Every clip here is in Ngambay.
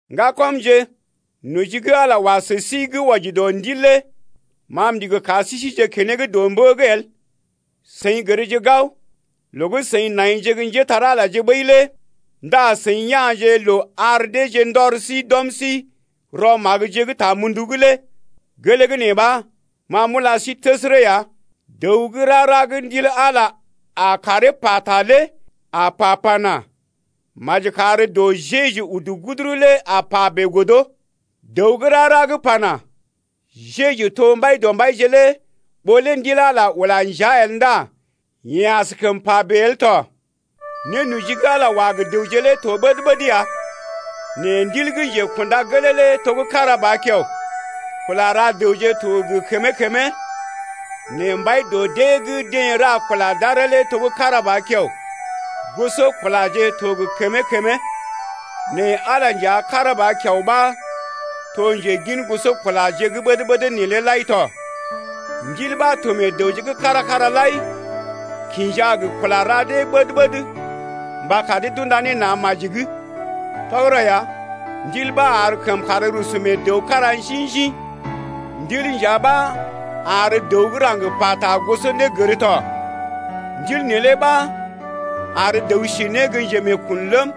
Ŋgakɔmje, noji gə́ Ala wa sə sí gə́ wɔji dɔ ndil lé ma m’ndigi kar sí sije keneŋ dɔ mbə’g el. Seḭ gərje gao, loo gə́ seḭ naije gə́ njépole-magəje ɓəi lé ndá seḭ ya̰je loo ar dee ndɔr sí d’ɔm sí rɔ magəje gə́ ta mundu’g lé. Gelee gə́ nee ɓa, ma m’ula sí təsərə ya, dəw gə́ rara gə́ Ndil Ala a karee pata lé a pa pana: Maji kar dɔ Jeju udu guduru lé a pa bèe godo. Dəw gə́ rara gə́ pana: Jeju to Mbaidɔmbaije lé ɓó lé Ndil Ala ula njea lé el ndá yeḛ askəm pa bèe el tɔ. Nénoji gə́ Ala wa gə dəwje lé to ɓəd-ɓəd ya nɛ Ndil gə́ njekunda gelee lé to gə́ kára ba kiao. Kula ra dəwje to gə kəmee-kəmee, nɛ Mbai dɔ dee gə́ deḛ ra kula d’aree lé to gə́ kára ba kiao. Gosɔkulaje to gə kəmee-kəmee, nɛ Ala nja kára ba kiao ɓa to njegin gosɔkulaje gə́ ɓəd-ɓəd neelé lai tɔ. Ndil ɓa to meḛ dəwje’g kára-kára lai kinja gə kula ra dee ɓəd-ɓəd mba kar dee d’unda ne na̰ maji’g. Tɔgərɔ ya, Ndil ɓa ar kəmkàr rusu mee dəw kára njḭ-njḭ. Ndil nja ɓa ar dəw gə́ raŋg pata gosonégər tɔ. Ndil neelé ɓa ar dəw si ne gə njemeekun ləm,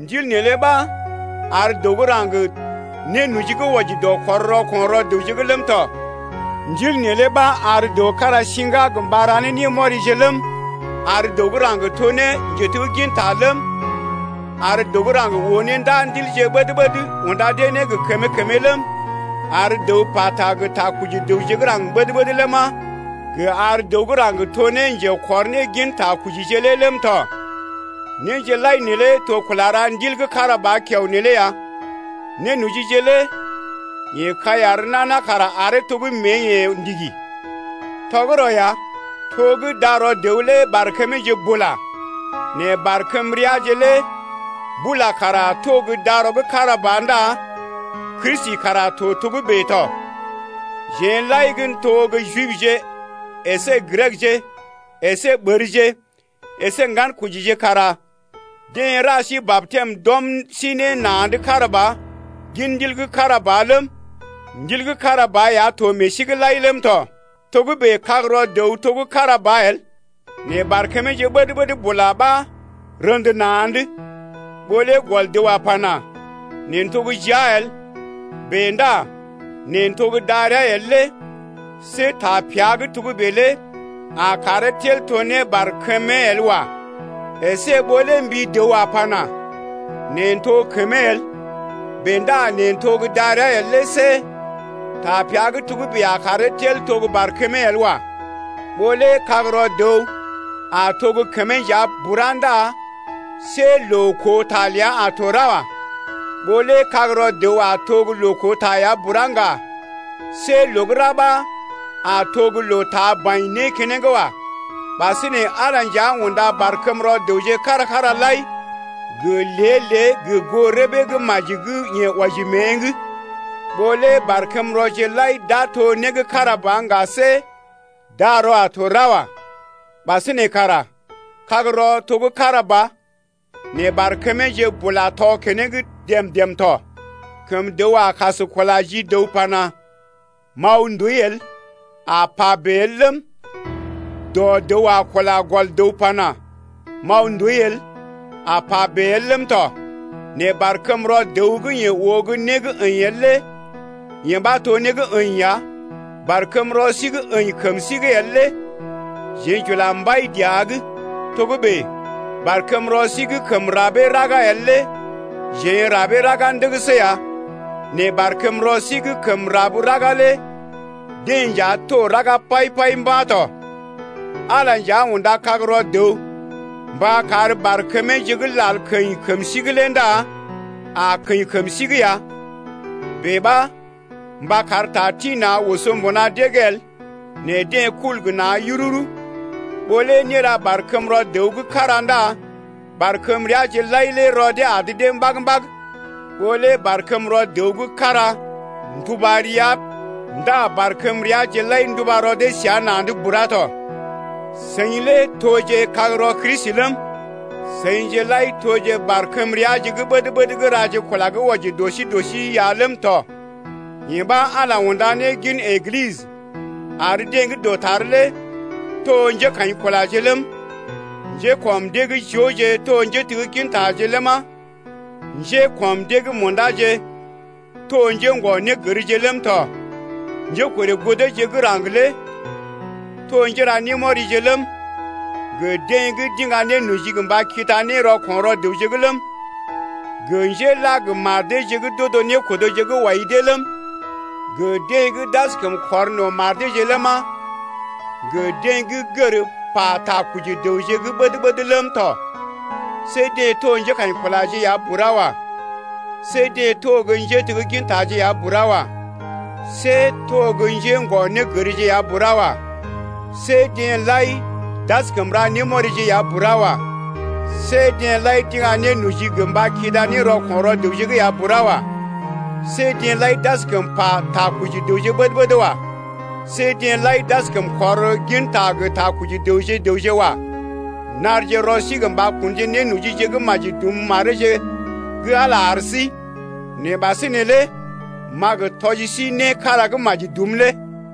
Ndil neelé ɓa ar dəw gə́ raŋg nénoji gə́ wɔji dɔ kɔr rɔko̰ rɔ dəwje’g ləm tɔ. Ndil neelé ɓa ar dəw kára siŋga gə mba ra ne némɔrije ləm, ar dəw gə́ raŋg to ne njetegginta ləm, ar dəw gə́ raŋg oo ne ndaa ndilje ɓəd-ɓəd unda dee ne gə kəmee-kəmee ləm, ar dəw pata gə takɔji dəwje gə́ raŋg ɓəd-ɓəd ləma, gə ar dəw gə́ raŋg to ne njekɔr ne gin takɔjije lé ləm tɔ. Néje lai neelé to kula ra Ndil gə́ kára ba kiao neelé ya. Nénojije lé yeḛ kai ar nana kara aree to gə́ mée-yeḛ ndigi. Tɔgərɔ ya, to gə́ darɔ dəw lé barkəmeeje bula nɛ barkəmreaje lé bula kara to gə́ darɔ gə́ kára ba ndá Kristi kara to togə́bè tɔ. Jeḛ lai gə́ to gə́ Jibje əsé Grekje, əsé ɓərje, əsé ŋgankojije kara deḛ ra sí batɛm d’ɔm sí ne na̰’d kára ba gin Ndil gə́ kára ba ləm, Ndil gə́ kára ba ya to meḛ sí’g lai ləm tɔ. Togə́bè kagrɔ dəw to gə́ kára ba el, nɛ barkəmeeje ɓəd-ɓəd bula ɓa rḛdə na̰’d. Ɓó lé gɔl dəw a pana: Neḛ n’to gə́ jia el, bèe ndá neḛ n’to gə́ darəa el lé see tapea gə́ togə́bè lé a karee tel to ne barkəmee el wa. Esé ɓó lé mbi dəw a pana: Neḛ n’to kəmee el, bèe ndá neḛ n’to gə́ darəa el lé see tapea gə́ togə́bè a karee tel to gə́ barkəmee el wa. Ɓó lé kagrɔ dəw a to gə́ kəmee nja bura ndá see loo koo ta ləa a to ra wa. Ɓó lé kagrɔ dəw a to gə́ loo koo ta ya bura ŋga, see loo gə́ ra ɓa a to gə́ loo taa baḭ né keneŋ wa. Ɓasinè Ala nja unda barkəmrɔ dəwje kára-kára lai gə lée-lée gə goo rəbee gə́ maji gə́ yeḛ wɔji mée’g. Ɓó lé barkəmrɔje lai d’a to né gə́ kára ba ŋga, see darɔ a to ra wa. Ɓasinè kara kagrɔ to gə́ kára ba nɛ barkəmeeje bula tɔ keneŋ dèm-dèm tɔ. Kəm dəw a kas kula ji dəw pana: M’aw ndooi el, a pa bèe el ləm, dɔ dəw a kula gɔl dəw pana: M’aw ndooi el, a pa bèe el ləm tɔ. Nɛ barkəmrɔ dəw gə́ yeḛ oo gə́ né gə́ əḭ el lé yee ɓa to né gə́ əḭ ya. Barkəmrɔ sí gə́ əḭ kəm sí’g el lé jeḛ j’ula mbai dəa’g. Togə́bè barkəmrɔ sí gə́ kəm rabee raga el lé jeḛ n’rabee raga ndəgəsə ya nɛ barkəmrɔ sí gə́ kəm rab raga lé deḛ nja to raga pai-pai mba̰ tɔ. Ala nja unda kagrɔ dəw mba kar barkəmeeje gə́ lal keḭ kəm sí’g lé ndá a keḭ kəm sí’g ya. Bèe ɓa mba kar ta tḭ-na̰ oso mbuna dee’g el nɛ deḛ kul gə na̰ yururu. Ɓó lé né ra barkəmrɔ dəw gə́ kára ndá barkəmreaje lai lé rɔ dee adə dee mbag-mbag. Ɓó lé barkəmrɔ dəw gə́ kára nduba rəa ndá barkəmreaje lai nduba rɔ dee səa na̰’d bura tɔ. Seḭ lé toje kagrɔ Kristi ləm, seḭje lai toje barkəmreaje gə́ ɓəd-ɓəd gə́ raje kula gə́ wɔji dɔ sí dɔ sí ya ləm tɔ. Yee ɓa Ala unda ne gin Eglisə, ar deḛ gə́ dɔtar lé to njékaḭkulaje ləm, njékɔm dee’g jooje to njéteggintaje ləma, njékɔm dee’g mṵdaje to njḛ́gɔ-négərje ləm tɔ, njékorè goo deeje gə́ raŋg lé to njéra némɔrije ləm, gə deḛ gə́ d’iŋga nénoji mba kida ne rɔko̰ rɔ dəwje’g ləm, gə njéla gə mar deeje gə́ d’odo nékodoje gə́ wɔi dee ləm, gə deḛ gə́ d’askəm kɔr no̰ mar deeje ləma, gə deḛ gə́ gər pa takɔji dəwje gə́ ɓəd-ɓəd ləm tɔ. See deḛ to njékaḭkulaje ya bura wa. See deḛ to gə́ njéteggintaje ya bura wa. See to gə́ njḛ́gɔ-négərje ya bura wa. See deḛ lai d’askəm ra némɔrije ya bura wa. See deḛ lai d’iŋga nénoji gə mba kida ne rɔko̰ rɔ dəwje’g ya bura wa. See deḛ lai d’askəm pa takɔji dəwje gə́ ɓəd-ɓəd wa. See deḛ lai d’askəm kɔr ginta gə takɔji dəwje-dəwje wa. Narje rɔ sí gə mba kunje ne nénojije gə́ maji dum mareeje gə́ Ala ar sí. Nɛ ɓasinè lé m’a gə tɔji sí né kára gə́ maji dum lé.